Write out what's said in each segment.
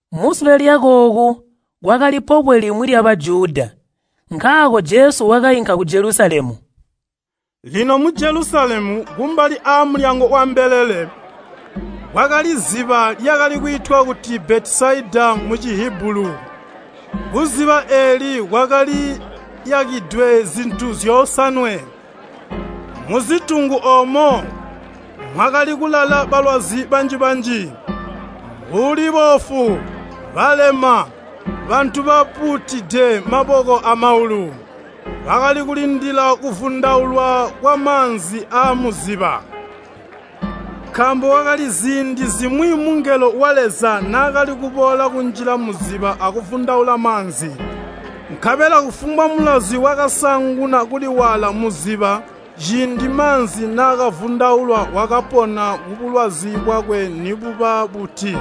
Musule lyakooku, kwakali pobwe limwi lya Bajuda, nkaako Jesu wakainka ku Jelusalemu. Lino mu Jelusalemu, kumbali aamulyango wambelele, kwakali ziba lyakali kwiitwa kuti Betesaida Mucihibulu. Kuziba eeli kwakaliyakidwe zitungu zyosanwe. Muzitungu oomo mwakali kulala balwazi banji-banji, mbuli boofu, balema, bantu bapuutide maboko amaulu, [bakali kulindila kuvundaulwa kwamaanzi aamuziba. Nkaambo kwakali ziindi zimwi mungelo wa Leza naakali kuboola kunjila muziba akuvundaula maanzi. Nkabela kufumbwa mulwazi wakasaanguna kuliwaala muziba ciindi maanzi naakavundaulwa wakapona kubulwazi bwakwe nibuba buti.]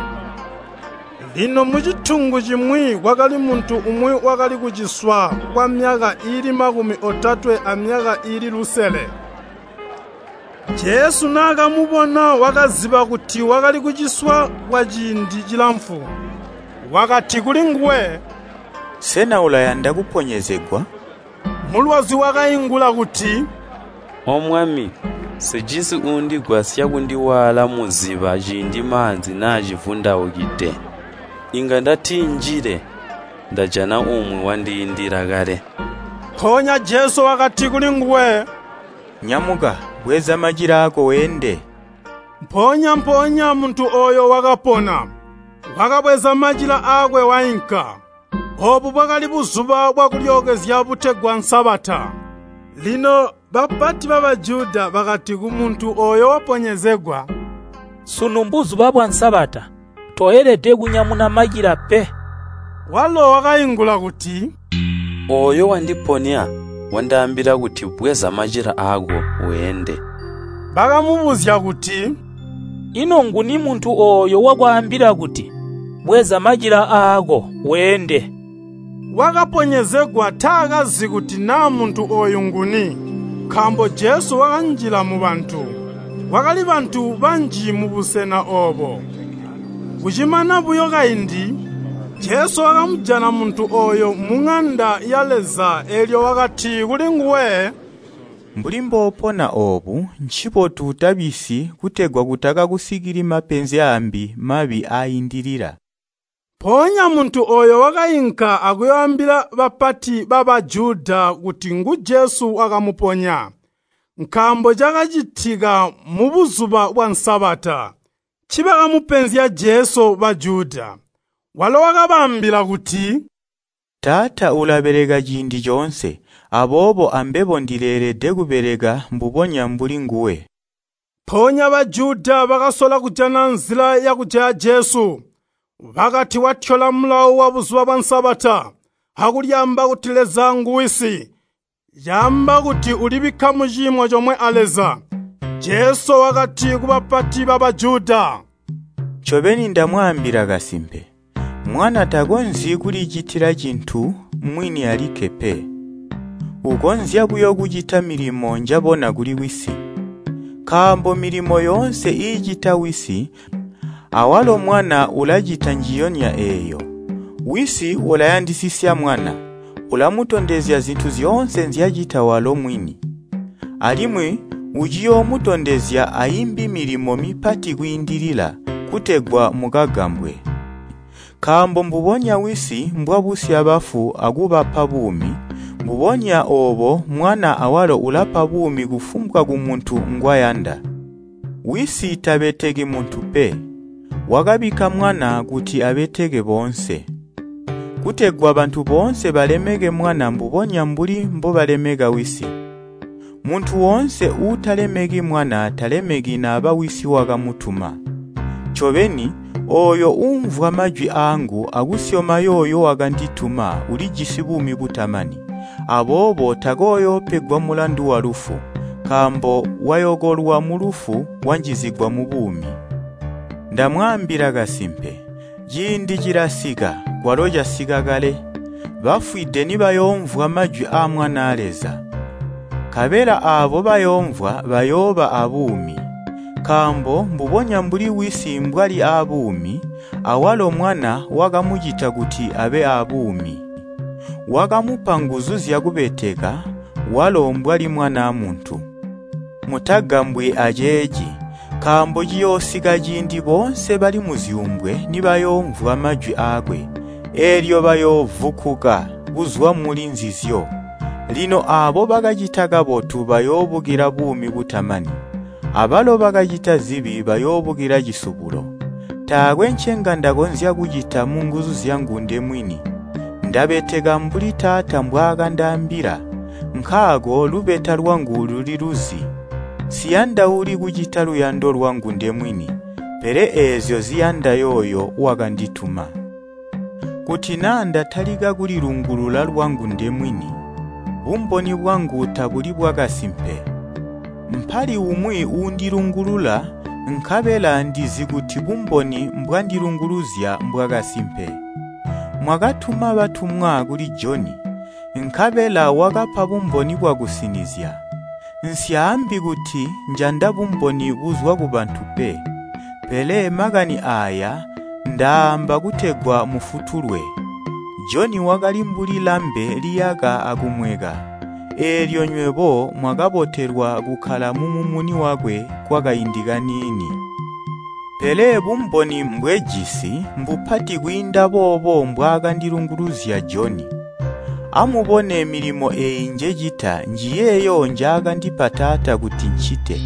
Lino mucitungu cimwi kwakali muntu umwi wakali kuciswa kwamyaka iili makumi otatwe amyaka iili lusele. Jesu naakamubona wakaziba kuti wakali kuciswa kwaciindi cilamfu. Wakati kulinguwe, “Sena ulayanda kuponyezegwa?” Mulwazi wakaingula kuti, “O Mwami, nsijisi uundigwasya kundiwaala muziba ciindi maanzi naacivundaukide. Inga ndatitinjile, ndajana umwi wandiindila kale.” Mpoonya Jesu wakati kulinguwe, “Nyamuka, bweza macila aako weende.” Mpoonya-mpoonya muntu ooyo wakapona, wakabweza macila aakwe wainka. Oobu bwakali Buzuba bwa kulyookezya butegwa Sabata. Lino bapati ba Bajuda bakati kumuntu ooyo wakaponyezegwa, “Sunu Mbuzuba bwa Sabata. Toelede kunyamuna macila pe.” Walo wakaingula kuti, “Ooyo wandiponya wandaambila kuti, ‘Bweza macila aako, weende!’” Bakamubuzya kuti, “Ino nguni muntu ooyo wakwaambila kuti, ‘Bweza macila aako, weende?’” Wakaponyezegwa taakazi kuti naa muntu ooyo nguni, nkaambo Jesu wakanjila mubantu, kwakali bantu banji mubusena oobo. Kucimana buyo kaindi, Jesu wakamujana muntu ooyo muŋanda ya Leza, eelyo wakati kulinguwe, “Mbuli mboopona oobu, ncibotu utabisyi kutegwa kutakakusikili mapenzi aambi mabi aaindilila.” Mpoonya muntu ooyo wakainka akuyooambila bapati ba Bajuda kuti ngu Jesu wakamuponya. Nkaambo cakacitika mu Buzuba bwa Sabata, ncibakamupenzya Jesu Bajuda. Walo wakabaambila kuti, “Taata ulabeleka ciindi coonse, aboobo ambebo ndileelede kubeleka mbubonya mbuli nguwe.” Mpoonya Bajuda bakasola kujana nzila yakujaya Jesu. Bakati watyola mulawo wa Buzuba bwa Sabata, akulyaamba kuti Leza ngu Wisi. Caamba kuti ulibika muciimo comwe a Leza. Jesu wakati ku bapati ba Bajuda, “Ncobeni ndamwaambila kasimpe, Mwana takonzyi kulicitila cintu mwini alikke pe. Ukonzya buyo kucita milimo njabona kuli Wisi, nkaambo milimo yoonse iicita Wisi awalo Mwana ulacita njiyonya eeyo. Wisi ulayandisisya Mwana, ulamutondezya zintu zyoonse nzyacita walo mwini. Alimwi uciyoomutondezya aimbi milimo mipati kwiindilila, kutegwa mukagambwe. Nkaambo mbubonya Wisi mbwabusya bafu akubapa buumi, mbubonya oobo Mwana awalo ulapa buumi kufumbwa kumuntu ngwayanda. Wisi tabeteki muntu pe, wakabikka Mwana kuti abeteke boonse. Kutegwa bantu boonse balemeke Mwana mbubonya mbuli mbobalemeka Wisi. Muntu woonse uutalemeki Mwana talemeki naba Wisi wakamutuma. “Ncobeni, ooyo uumvwa majwi aangu akusyoma yooyo wakandituma, ulijisi buumi butamani. Aboobo takooyoopegwa mulandu walufu, nkaambo wayokolwa mulufu, wanjizigwa mubuumi. Ndamwaambila kasimpe, ciindi cilasika, kwalo casika kale, bafwide nibayoomvwa majwi aa Mwanaa Leza, nkabela aabo bayoomvwa bayooba aabuumi. Nkaambo mbubonya mbuli Wisi mbwali aabuumi, awalo Mwana wakamucita kuti abe aabuumi. Wakamupa nguzu zyakubeteka, walo mbwali Mwanaa Muntu. Mutagambwi aceeci, nkaambo ciyoosika ciindi boonse bali muzyuumbwe nibayoomvwa majwi aakwe, eelyo bayoovukkuka kuzwa muli nzinzyo. Lino aabo bakacita kabotu bayoobukila buumi butamani, abalo bakacita zibi bayoobukila cisubulo. “Taakwe ncenga ndakonzya kucita munguzu zyangu ndemwini, ndabeteka mbuli Taata mbwaakandaambila, nkaako lubeta lwangu luliluzi. Nsiyandauli kucita luyando lwangu ndemwini, pele eezyo ziyanda yooyo wakandituma. “Kuti naa ndatalika kulilungulula lwangu ndemwini, bumboni bwangu tabuli bwakasimpe. Mpali umwi uundilungulula, nkabela ndizi kuti bumboni mbwandilunguluzya mbwakasimpe. Mwakatuma batumwa kuli Joni, nkabela wakapa bumboni bwakusinizya. Nsyaambi kuti njanda bumboni buzwa kubantu pe, pele makani aaya ndaaamba kutegwa mufutulwe. Joni wakali mbuli lambe liyaka akumweka, eelyo nywebo mwakabotelwa kukkala mumumuni wakwe kwakaindi kaniini. Pele bumboni mbwejisi mbupati kwiinda boobo mbwaakandilunguluzya Joni. Amubone milimo eeyi njecita njiyeeyo njaakandipa Taata kuti ncite.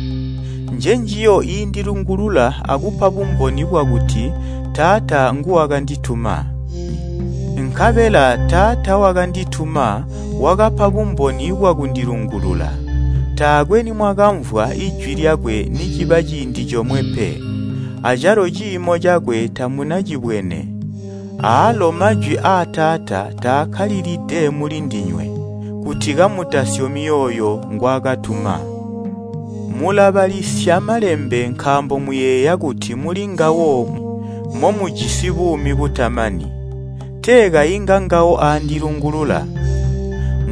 Njenjiyo iindilungulula akupa bumboni bwakuti Taata nguwakandituma. Nkabela Taata wakandituma wakapa bumboni bwakundilungulula. Taakwe nimwakamvwa Ijwi lyakwe niciba ciindi comwe pe, acalo ciimo cakwe tamunacibwene. Aalo majwi aa Taata taakkalilide mulindinywe, kuti kamutasyomi yooyo ngwaakatuma. Mulabalisya Malembe nkaambo muyeeya kuti mulingawo momujisi buumi butamani. Tee kayi ngangawo aandilungulula.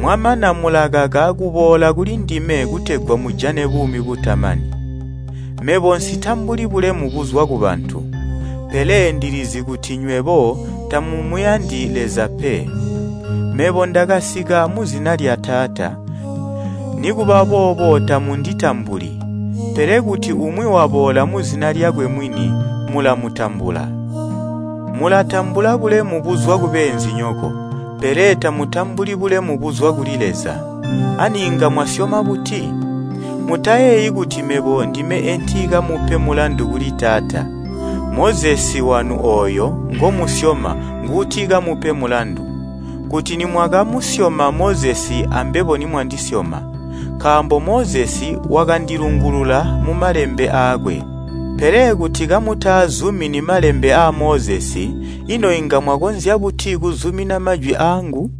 Mwamana mulakaka kuboola kulindime kutegwa mujane buumi butamani. Mebo nsitambuli bulemu buzwa kubantu. Pele ndilizi kuti nywebo tamumuyandi Leza pe. Mebo ndakasika muzina lya Taata, nikuba boobo tamunditambuli. Pele kuti umwi waboola muzina lyakwe mwini, mulamutambula. Mulatambula bulemu buzwa kubeenzinyoko, pele tamutambuli bulemu buzwa kuli Leza. Ani inga mwasyoma buti? Mutayeeyi kuti mebo ndime entikamupe mulandu kuli Taata. Mozesi wanu ooyo ngomusyoma nguutikamupe mulandu. Kuti nimwakamusyoma Mozesi ambebo nimwandisyoma, nkaambo Mozesi wakandilungulula mumalembe aakwe. Pele kuti kamutaazumini malembe aa Mozesi ino inga mwakonzya buti kuzumina majwi aangu?”